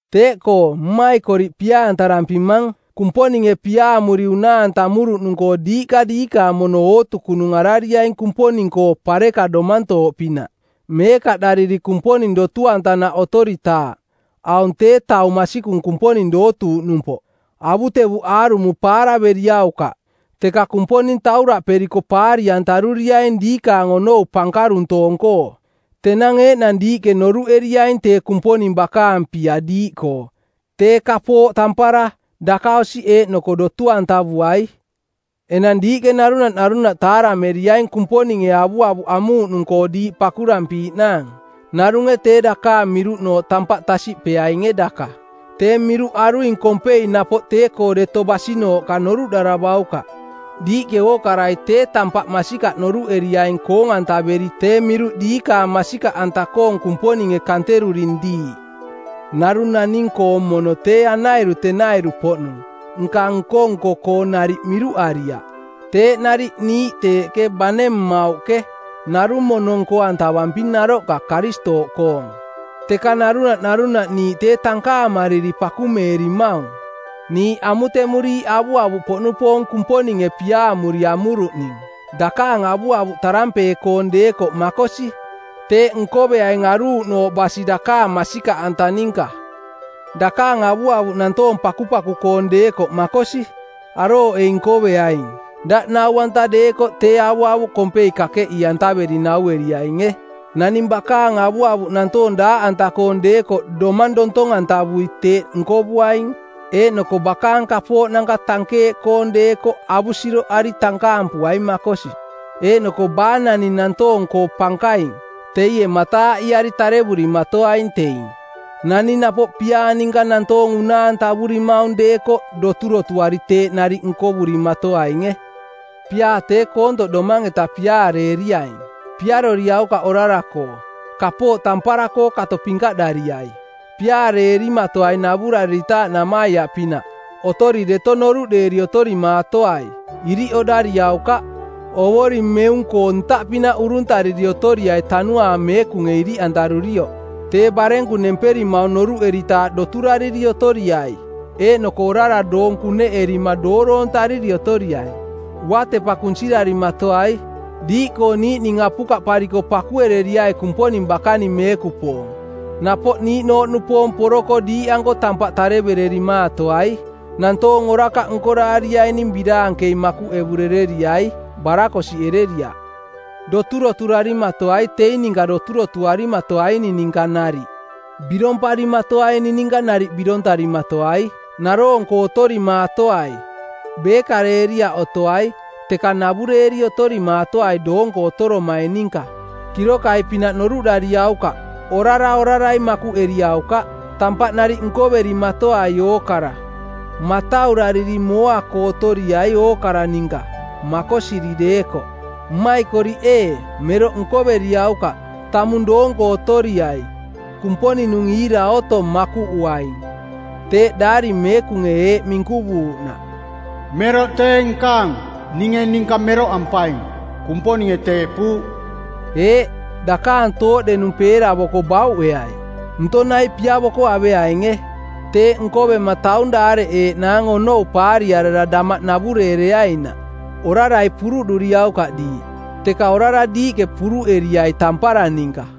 Teeꞌkoo, mmaikoriꞌ pia-antarampimang, Kumponinge piaamuri unaa-antamuruꞌnung-koo diiꞌka diikaang mono ootukunung arariaing Kumponing-koo pareka domantooꞌpinaꞌ, meekaꞌ dariri Kumponing dotu-antanaꞌ otoritaaꞌ. Aung tee taung masikung Kumponing dootuuꞌnumpoꞌ. Avutevuꞌ aarumo paaraveriaukaꞌ teka Kumponing tauraꞌperiko paari-antaruriaing diikaang onou pankaruntoong-koo. Tenang eeꞌnang diiꞌke noruꞌeriaing tee Kumponing bakaang pia diiꞌkoo, tee kapooꞌ tampara, dakaosiꞌ eeꞌnoko dotu-antavuai. Enang diiꞌke narunaꞌ narunaꞌ taarameriaing Kumponinge avuavuꞌ amuuꞌnung-koo diiꞌ pakurampiiꞌnaang. Narunge tee dakaang miruꞌnooꞌ tampaꞌ tasiꞌpeainge daka. Tee miruꞌ aruing kompei napoꞌ tee-koo deto basinooꞌka noruꞌdaravaukaꞌ. Diiꞌke ookarai tee tampaꞌ masikaꞌ noruꞌeriaing koong-antaveri tee miruꞌ diikaang masikaꞌanta-koong Kumponinge kanteruring diiꞌ. Narung naning-koong mono tee anairu tenairu-poꞌnung, nka nko-nko-koo nariꞌ miruꞌariaꞌ. Teeꞌ nariꞌ, niiꞌ teeꞌke, bane mmauꞌke, narung mono nko-antavamping naroꞌka Karistooꞌkoong. Teka narunaꞌ narunaꞌ niiꞌ tee tankaamariri pakumeerimaung. Niiꞌ amutemuriiꞌ avuavuꞌpoꞌnupoong Kumponinge piaamuri amuruꞌning. Dakaang avuavuꞌ tarampee-koong˜ deekoꞌ makosi, teeꞌ nkoveaing aruuꞌnooꞌ basi dakaang masikaꞌanta ninka. Dakaang avuavuꞌ nantoong pakupaku-koong deekoꞌ makosi, arooꞌei nkoveaing. Daꞌ nau-anta deekoꞌ tee avuavuꞌ kompei kakeꞌii-antaveri naueriainge. Naning bakaang avuavuꞌ nantoong daaꞌanta-koong deekoꞌ domang dontong-antavui teeꞌ nkovuaing. Eeꞌnoko bakaang kapooꞌnanka tankeeꞌkoong deekoꞌ avusiroꞌari tankaampuaing makosi. Eeꞌnoko baa naning nantoong-koo pankaing, teie mataaꞌiari tarevurimatoaing teing. Naning napoꞌ piaa ninka nantoong unaa-antavurimaung deekoꞌ, doturotuari teeꞌ nariꞌ nkovurimatoainge. Piaa tee koontoꞌ domang-eta piaareeriaing. Piaroriaukaꞌ orara-koo. Kapooꞌ tampara-koo kato pinkaꞌdariai. Piaareerimaatoai navurariritaaꞌ namaiaꞌpinaꞌ. Otori deto noruꞌdeeri otorimaatoai. Iriꞌ oꞌdariaukaꞌ. Ovoring meung-koo ntaꞌpinaꞌ uruntariri otoriai Tanuaang Meekunge iriꞌantarurioꞌ. Tee barenku nemperimaung noruꞌeritaaꞌ doturariri otoriai eeꞌnoko orara doong kuneꞌerima dooroontariri otoriai. Uatepa kunsirarimatoai. Diiꞌkoo niiꞌning apukaꞌpariko pakuereriai Kumponing bakaning meekupoong. Napoꞌ niiꞌnooꞌnupoong poroko diiꞌanko tampaꞌ tarevererimaatoai. Nantoong orakaꞌ nkoraariaining biraankei makuꞌevurereriai, barakosiꞌereriaꞌ. Doturoturarimatoai teing ninka doturotuarimatoaining ninka nariꞌ. Biromparimatoaining ninka nariꞌ birontarimatoai. Naroong-koo otorimaatoai. Beekareeriaꞌ otoai, teka navureeri otorimaatoai doonko otoromaing ninka. Kirokai-pinaꞌ noruꞌdariaukaꞌ. Orara orarai makuꞌeriaukaꞌ. Tampaꞌ nariꞌ nkoverimatoai ookara. Mataurariri mooa-koo otoriai ookara ninka, makosiri deekoꞌ. Mmaikoriꞌ ee, meroꞌ nkoveriaukaꞌ. Tamung doonko otoriai. Kumponing-nung iira otong, makuꞌuaing. Teeꞌ Daari Meekunge eeꞌ minkuvuuꞌnaꞌ, “Meroꞌ tee nkaang. Ninge ninka meroꞌampaing. Kumponinge teeꞌpuuꞌ.” Eeꞌ, dakaang tooꞌdenung peeravoko bauꞌeai. Ntong nai piavoko aveainge. Teeꞌ nkovema taung daareꞌeeꞌnaang onou paariarara damaꞌ navureereainaꞌ. Orarai puruꞌduriaukaꞌ diiꞌ, teka orara diiꞌke puruꞌeriai tampara ninka.